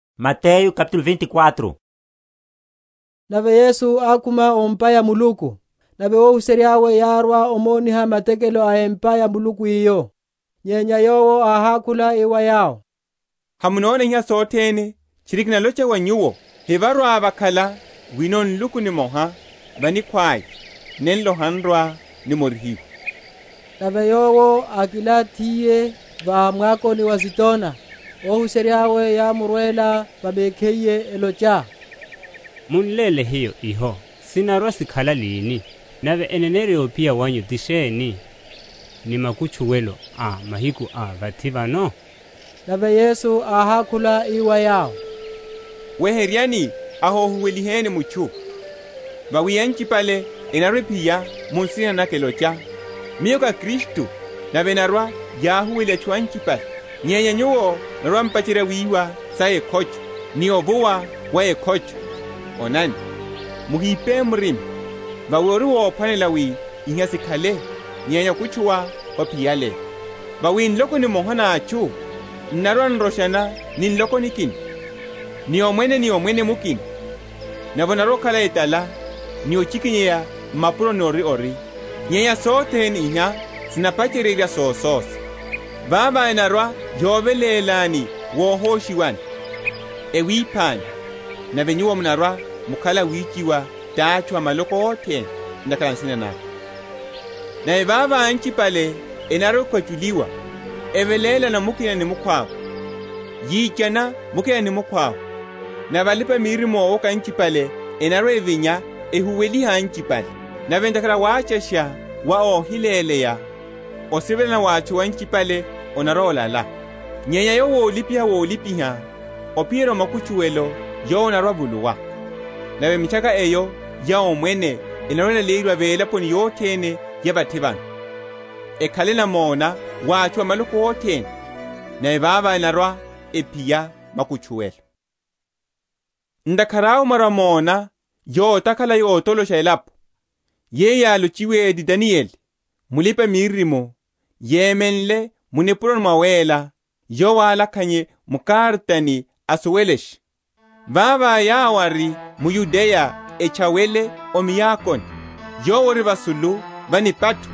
Sohosha sa muhólo. Mapacheryeryo aya. Nave Yesu ákhuma o m’pa ya Muluku; nave óhuserya’we yárwa omoniha matekelo a empa ya Muluku eyo. Nyenya Yowo áhákhula ii wa yawo, Hamunona iha sothene? Tchiri kinalocha wa nyuwo, hevarwa‐vakhala wino nluku nimoha va nikhwaya, nenlo han’rwa‐nimorihiwa. Nave Yowo ákilanthiye, va mwakoni wa Azitona, óhuserya yámurwela va mekhiye, elocha, Mun’léle hiyo iho sinarwa‐sikhala lini? nave eneneryo ya ophiya wanyu ti sheni, ni makutchuwelo a mahiku a vathi vano? Nave Yesu áhákhula ii wa yawo, Weheryani, ahohuweliheni mutchu. Vawi anchipale enarwa‐ephiya mu nsina naka, elocha, Miyo ká Kristu, nave enarwa‐yahuweliha atchu anchipale. Nyenya nyuwo munarwa‐m’pacherya wiwa sa ekhocho, ni ovuwa wa ekhocho: onani, muhipe murima: vawi ori wophwanela wi iha sikhale; nyenya okutchuwa hophiyale. Vawi nloko nimoha na atchu n’narwa‐n’roshana ni nloko nikina, ni omwene ni omwene mukina; nave onarwa‐okhala etala ni ochikinyeya m’mapuro ori ori. Nyenya sothene iha sinapacheryerya sososa. Vavo enarwa‐yovelélani wuhoshiwani, ewiphani: nave nyuwo munarwa‐mukhala awichiwa ti atchu a maloko othene, ntakhara a nsina naka. Nave vavo anchipale enarwa‐ekwachuliwa, evelélana mukina ni mukhwawe, yichana mukina ni mukhwawe. Nave alipa‐miririmo ówoka anchipale enarwa evinya, ehuweliha anchipale. Nave ntakhara a wachasha wa óhiléleya, osivelana wa atchu anchipale onarwa‐olala. Nyenya yowo ólipiha wolipiha ophiyerya o makutchuwelo, yowo anarwa‐avuluwa. Nave mitchaka eyo ya Omwene enarwa‐elaleyeryiwa velaponi yothene ya vathi vano, ekhale namona wa atchu a maloko othene; nave vavo enarwa‐ephiya makutchuwelo. Yohosha etokotoko. Ntakhara awe mwarwa‐mona yotakhala yotolosha elapo, yeyo yálochiwe ti Danieli mulipa‐miririmo, yemenle mu nipuroni nawéla (yowo álakhannye m’karatani asuwelashe:) vavo yawo ari m’Yudeya etchawele o miakoni: yowo ori vasulu va nipatho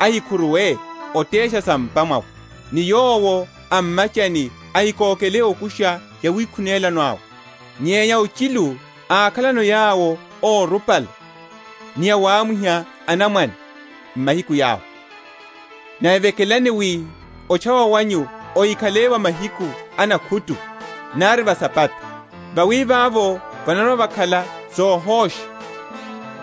ahikhuruwe otesha sa m’pa mwawe; ni yowo a m’machani ahikoke okusha yawikhunela’we. Nyenya ochilu akhalano yawo órupala, ni awamwiha anamwane m’mahiku yawo! Nave vekelani wi otchawa wanyu ohikhale va mahiku a nakhutu, nari va Sabata: vawi vavo vanarwa‐vakhala sohoshasha,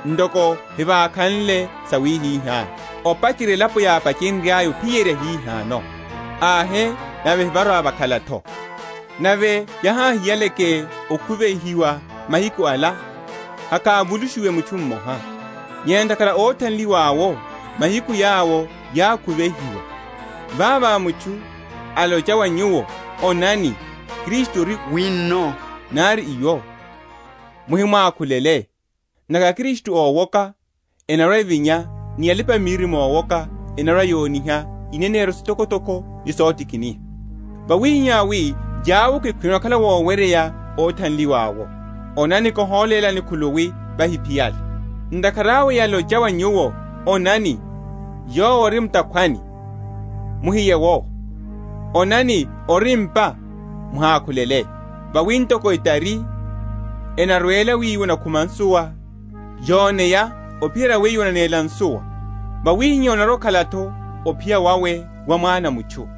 ntoko hevakhanle sawihihá, opacherya elapo yápachenryaya, ophiyerya hihano, ahe nave hevarwa‐vakhala’tho. Nave yaháhiyaleke okhuvihiwa mahiku ala, hakávulushiwe mutchu mmoha: nyenya ntakhara a óthanliwa’wo mahiku yawo yákhuvihiwa. Vavo mutchu alocha wa nyuwo, Onani, Kristu ori wino, nari iwo, muhimwakhulele; ntakhara aKristu ówoka enarwa‐evinya, ni alipa‐miririmo ówoka, enarwa‐yoniha ineneryo sitokotoko ni sotikiniha; wawihihá wi yawoke, khwino onakhala woweryeya, óthanliwa’wo. Onani kiholélani khuluwi vahiphiyale. Ntakhara awe yalocha wa nyuwo, Onani, Yowo ori m’takhwani; muhiye’wo. Onani, ori m’pa; muhákhulele. Vawi ntoko etari enarwela wiwo onakhuma nsuwa, yoneya ophiyerya wiwo onanéla nsuwa; wawihihá onarwa‐okhala’tho ophiya wawe wa Mwana a mutchu.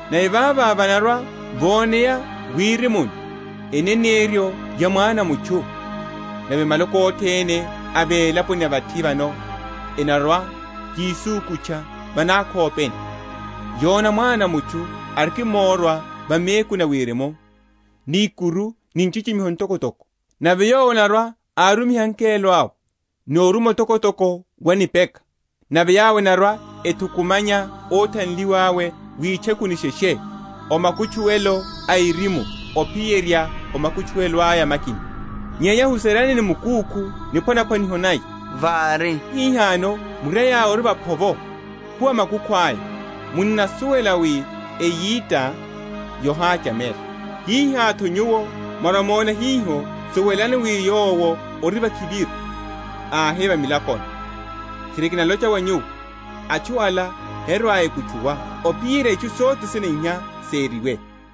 nave vavo vanarwa‐voneya mwirimuni, eneneryo ya Mwana a mutchu: nave maloko othene a velaponi ya vathi vano enarwa‐yisukutcha va nákhopeni, yona Mwana a mutchu arikimórwa va mekuni a wirimu, ni ikuru ni nchichimiho ntokotoko. Nave Yowo anarwa‐arumiha angelo awe ni oruma otokotoko wa nipeka. Nave yawo enarwa‐ethukumanya óthanliwa awe witchekuni sheshe, o makutchuwelo a erimu ophiyerya makutchuwelo aya makina. Nyenya huseryani ni mukúkhu niphwanaphwaniho naya; vári hihano murai aya ori waphovo, ophuwa makukhu aya, munnasuwela wi eyita yohachamela; hiha’tho nyuwo, mwarwa‐mona hiho, suwelashani wi Yowo ori vakhiviru, ahe va milakoni. Tchiri kinalocha wa nyuwo, Atchu ala herwa‐ekutchuwa, ophiyerya itchu sothene iha seriwe.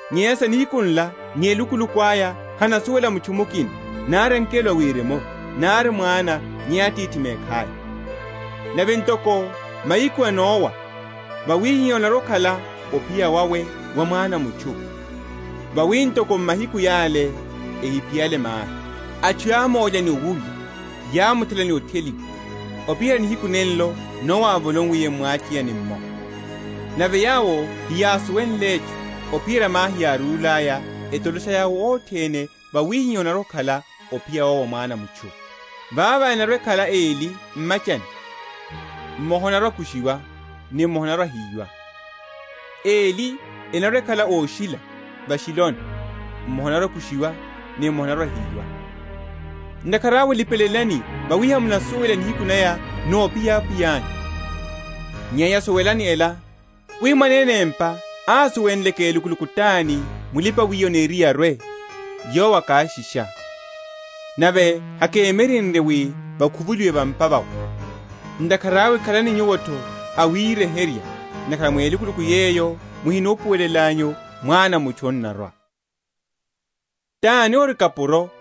Nyenya sa nihiku nla ni elukuluku aya hanasuwela mutchu mukina, nari angelo a Wirimu, nari Mwana, nyenya Atithi mekhaya. Nave ntoko mahiku a Nowa, wawihihá onarwa‐okhala ophiya wawe wa Mwana a mutchu. Vawi ntoko m’mahiku yale, ehiphiyale mahi, atchu yámólya ni owurya, yámthela ni otheliwa, ophiyerya nihiku nenlo Nowa ávolowiliye m’mwacheyani’mmo, nave yawo heyásuwenle etchu, ophiyerya mahi yárúlaya, etolosha yawo othene, wawihihá onarwa‐okhala ophiya wawe wa Mwana a mutchu. Vavo enarwa‐ekhala eli m’machani; mmoha anarwa‐akushiwa, ni mmoha anarwa‐ahiyiwa: eli enarwa‐ekhala óshila va’shiloni; mmoha anarwa‐akushiwa, ni mmoha anarwa‐ahiyiwa. Ntakhara awe lipelelani, vawi hamunasuwela nihiku naya nophiya Apwiya anyu. Nyenya suwelani ela, wi mwanene empa ásuwenleke elukuluku tani mulipa‐wiya aniriye arwe, yowo akáshisha, nave hakémyerenrye wi vakhuvuliwe va’mpa vawe. Ntakhara awe khalani nyuwo’tho awiryeherya; ntakhara mu elukuluku yeyo muhinupuwelanyu, Mwana a mutchu anarwa. Niphwanaphwaniho na akapuro eli.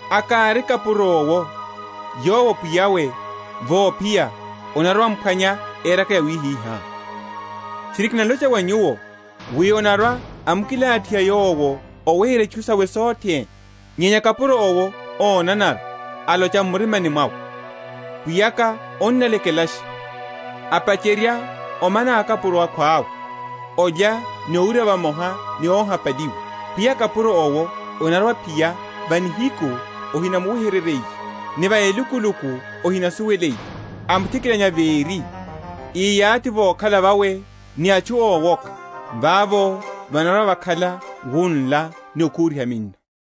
A’kari kapuro’wo yowo pwiya’we, vophiya, anarwa‐amphwanya éraka yawihiha. Tchiri, kinalocha wa nyuwo, wi anarwa‐amkilathiha yowo óweherya itchu sawe sothene. Nyenya kapuro’wo ónanara alocha m’murimani mwawe, Pwiya’ka annalekelasha; apacherya omana akapuro akhwawe, alya ni owurya vamoha ni óhapaliwa; pwiya a kapuro’wo anarwa‐aphiya va nihiku ahinamuweheryiye, ni va elukuluku ahinasuweliye, amuthikilanya véri, íyathi vokhala vawe ni atchu ówoka. Vavo vanarwa‐vakhala wunla ni okhuriha minno.